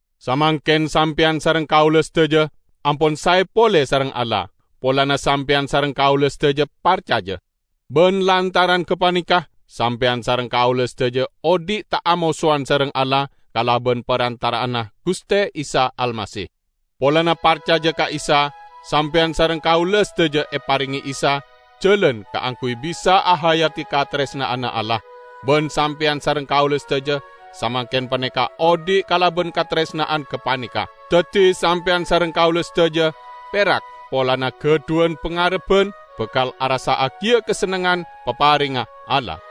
Samangken sampeyan sareng kaula sadaja ampon sae pole sareng Allah, polana sampeyan sareng kaula sadaja parcaja. Ban lantaran gapaneka, sampeyan sareng kaula sadaja odhi' ta' amosowan sareng Allah kalaban parantara'anna Guste Isa Almasih. Polana parcaja ka Isa sampeyan sareng kaula sadaja eparenge Isa jalan kaangguy bisa ahayadi kataresna'anna Allah; ban sampeyan sareng kaula sadaja samangken paneka odhi' kalaban kataresna'an gapaneka. Daddi sampeyan sareng kaula sadaja perak polana gadhuwan pangarebban bakal arassa'agiya kasennengngan paparengnga Allah!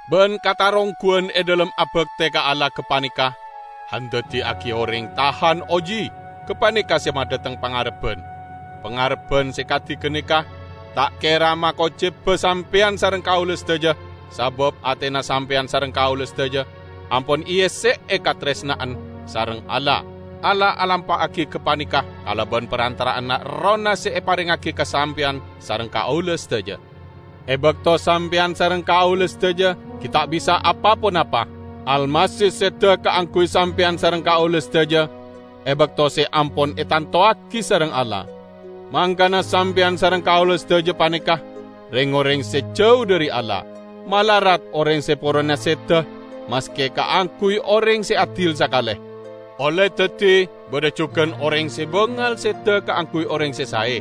ban katarongguwan e dhalem abakte ka Allah gapaneka andaddiyagi oreng tahan oji; gapaneka se madhateng pangarebban. Pangarebban se kadi ganeka ta' kera makoceba sampeyan sareng kaula sadaja sabab atena sampeyan sareng kaula sadaja ampon eesse'e kataresna'an sareng Allah. Allah alampa'agi gapaneka kalaban parantara'anna Errohna se eparengngagi ka sampeyan sareng kaula sadaja. E bakto sampeyan sareng kaula sadaja gi' ta' bisa apa-ponapa, Almasih seda kaangguy sampeyan sareng kaula sadaja e bakto se ampon etantowagi sareng Allah; mangkana sampeyan sareng kaula sadaja paneka reng-oreng se jau dhari Allah. Malarat oreng se porona seda maske kaangguy oreng se adil sakale. Olle daddi badha jugan oreng se bangal seda kaangguy oreng se sae.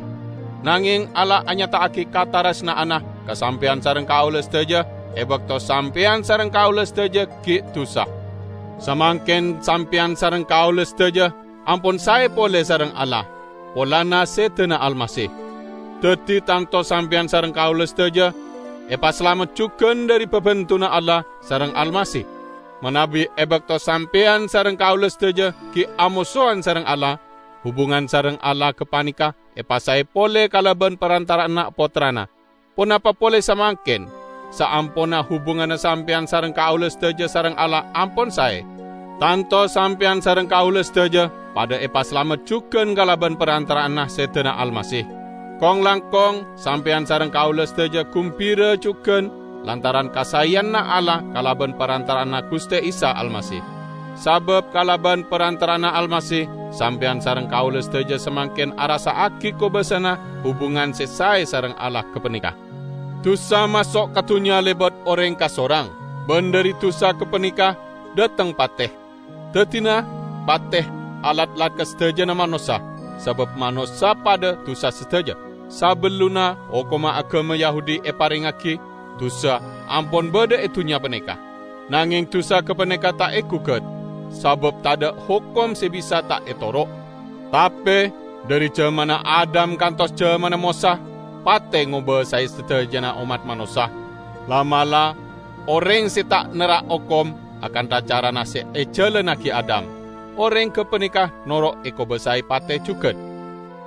Nangeng Allah anyata'agi kataresna'anna ka sampeyan sareng kaula sadaja e bakto sampeyan sareng kaula sadaja gi' dusa. Samangken sampeyan sareng kaula sadaja ampon sae pole sareng Allah, polana sedana Almasih; daddi tanto sampeyan sareng kaula sadaja epasalamet jugan dhari babendunna Allah sareng Almasih. Manabi e bakto sampeyan sareng kaula sadaja gi' amosowan sareng Allah, hubungan sareng Allah gapaneka epasae pole kalaban parantara'anna Pottrana, ponapa pole samangken, saamponna hubunganna sampeyan sareng kaula sadaja sareng Allah ampon sae, tanto sampeyan sareng kaula sadaja padha epasalamet jugan kalaban parantara'anna sedana Almasih. Kong-langkong, sampeyan sareng kaula sadaja gumbira jugan lantaran kasaeyanna Allah kalaban parantara'anna Guste Isa Almasih. Sabab kalaban parantara'anna Almasih, sampeyan sareng kaula sadaja samangken arassa'agi kobassana hubungan se sae sareng Allah gapaneka. Dusa maso' ka dunnya lebat oreng kasorang, ban dhari dusa gapaneka dhateng pate. Daddina, pate alatlat ka sadajana manossa, sabab manossa padha dusa sadaja. Sabellunna hokomma agama Yahudi eparengngagi, dusa ampon badha e dunnya paneka, nangeng dusa gapaneka ta' egugat, sabab tadha' hokom se bisa ta' etoro'. Tape, dhari jamanna Adam kantos ka jamanna Mosa, pate ngobasae sadajana ommat manossa. La'-mala' oreng se ta' nerrak hokom akantha carana se ejalannagi Adam, oreng gapaneka noro' ekobasae pate jugan.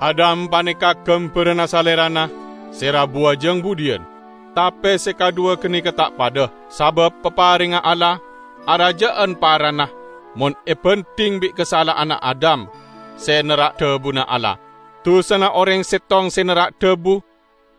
Adam paneka gambaranna Salerana se rabuwa jang budhiyan. Tape se kadhuwa ganeka ta' padha, sabab paparengnga Allah araja'an parana mon ebandhing bi' kasala'anna Adam se nerrak dhabuna Allah. Dusana oreng settong se nerrak dhabu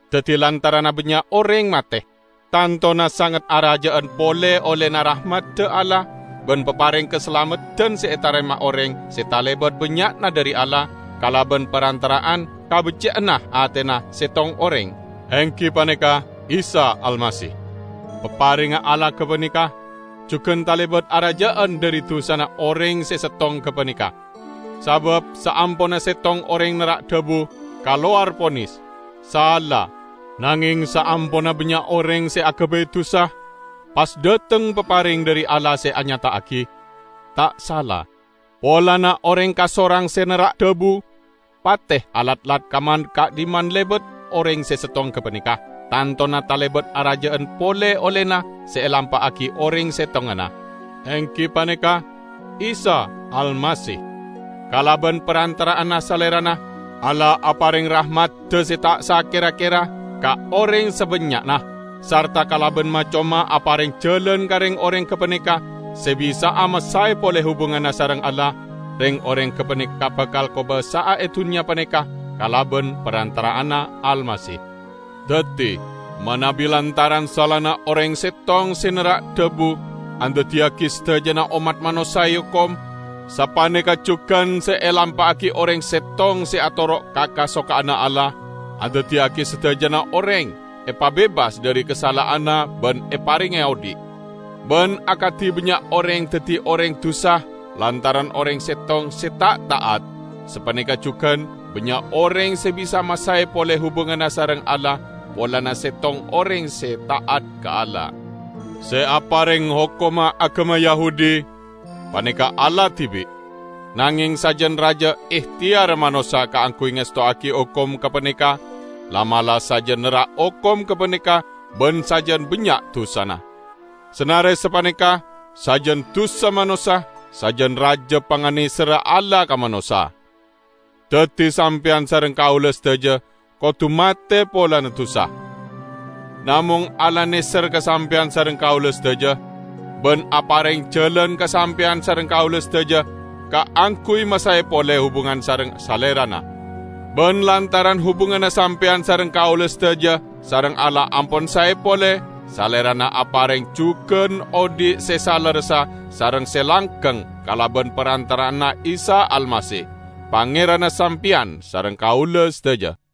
daddi lantaranna bannya' oreng mate. Tantona sanget araja'an pole ollena rahmadda Allah ban papareng kasalameddan se etarema oreng se talebat bannya'na dhari Allah kalaban parantara'an kabecce'anna atena settong oreng, enggi paneka Isa Almasih. Paparengnga Allah gapaneka jugan talebat araja'an dhari dusana oreng se settong gapaneka. Sabab saamponna settong oreng nerrak dhabu, kalowar ponis, "sala". Nangeng saamponna bannya' oreng se agabay dusa pas dhateng papareng dhari Allah se anyata'agi, "ta' sala". Polana oreng kasorang se nerrak dhabu, pate alatlat ka man-ka'dhimman lebat oreng se settong gapaneka. Tantona talebat araja'an pole ollena se elampa'agi oreng settonganna, enggi paneka Isa Almasih. Kalaban parantara'anna Salerana, Allah apareng rahmadda se ta' sakera-kera ka oreng sabannya'na, sarta kalaban ma-coma apareng jalan ka reng-oreng gapaneka se bisa'a masae pole hubunganna sareng Allah; reng-oreng gapaneka bakal kobasa'a e dunnya paneka kalaban parantara'anna Almasih. Daddi, manabi lantaran salana oreng settong se nerrak dhabu andaddiyagi sadajana ommat manossa eokom, sapaneka jugan se elampa'agi oreng settong se atoro' ka kasokanna Allah andaddiyagi sadajana oreng epabebas dhari kasala'anna ban eparenge odhi'. Ban akadi bannya' oreng daddi oreng dusa lantaran oreng settong se ta' ta'at, sapaneka jugan bannya' oreng se bisa masae pole hubunganna sareng Allah polana settong oreng se ta'at ka Allah. Se apareng hokomma agama Yahudi paneka Allah dibi'. Nangeng sajan raja ehteyarra manossa kaangguy ngestowagi hokom gapaneka, la'-mala' sajan nerrak hokom gapaneka ban sajan bannya' dusana. Sanare sapaneka, sajan dusa manossa, sajan raja panganeserra Allah ka manossa. Daddi sampeyan sareng kaula sadaja kodu mate polana dusa. Namong Allah neser ka sampeyan sareng kaula sadaja, ban apareng jalan ka sampeyan sareng kaula sadaja kaangguy masae pole hubungan sareng Salerana. Ban lantaran hubunganna sampeyan sareng kaula sadaja sareng Allah ampon sae pole, Salerana apareng jugan odhi' se salerressa sareng se langgeng kalaban parantara'anna Isa Almasih, Pangeranna sampeyan sareng kaula sadaja.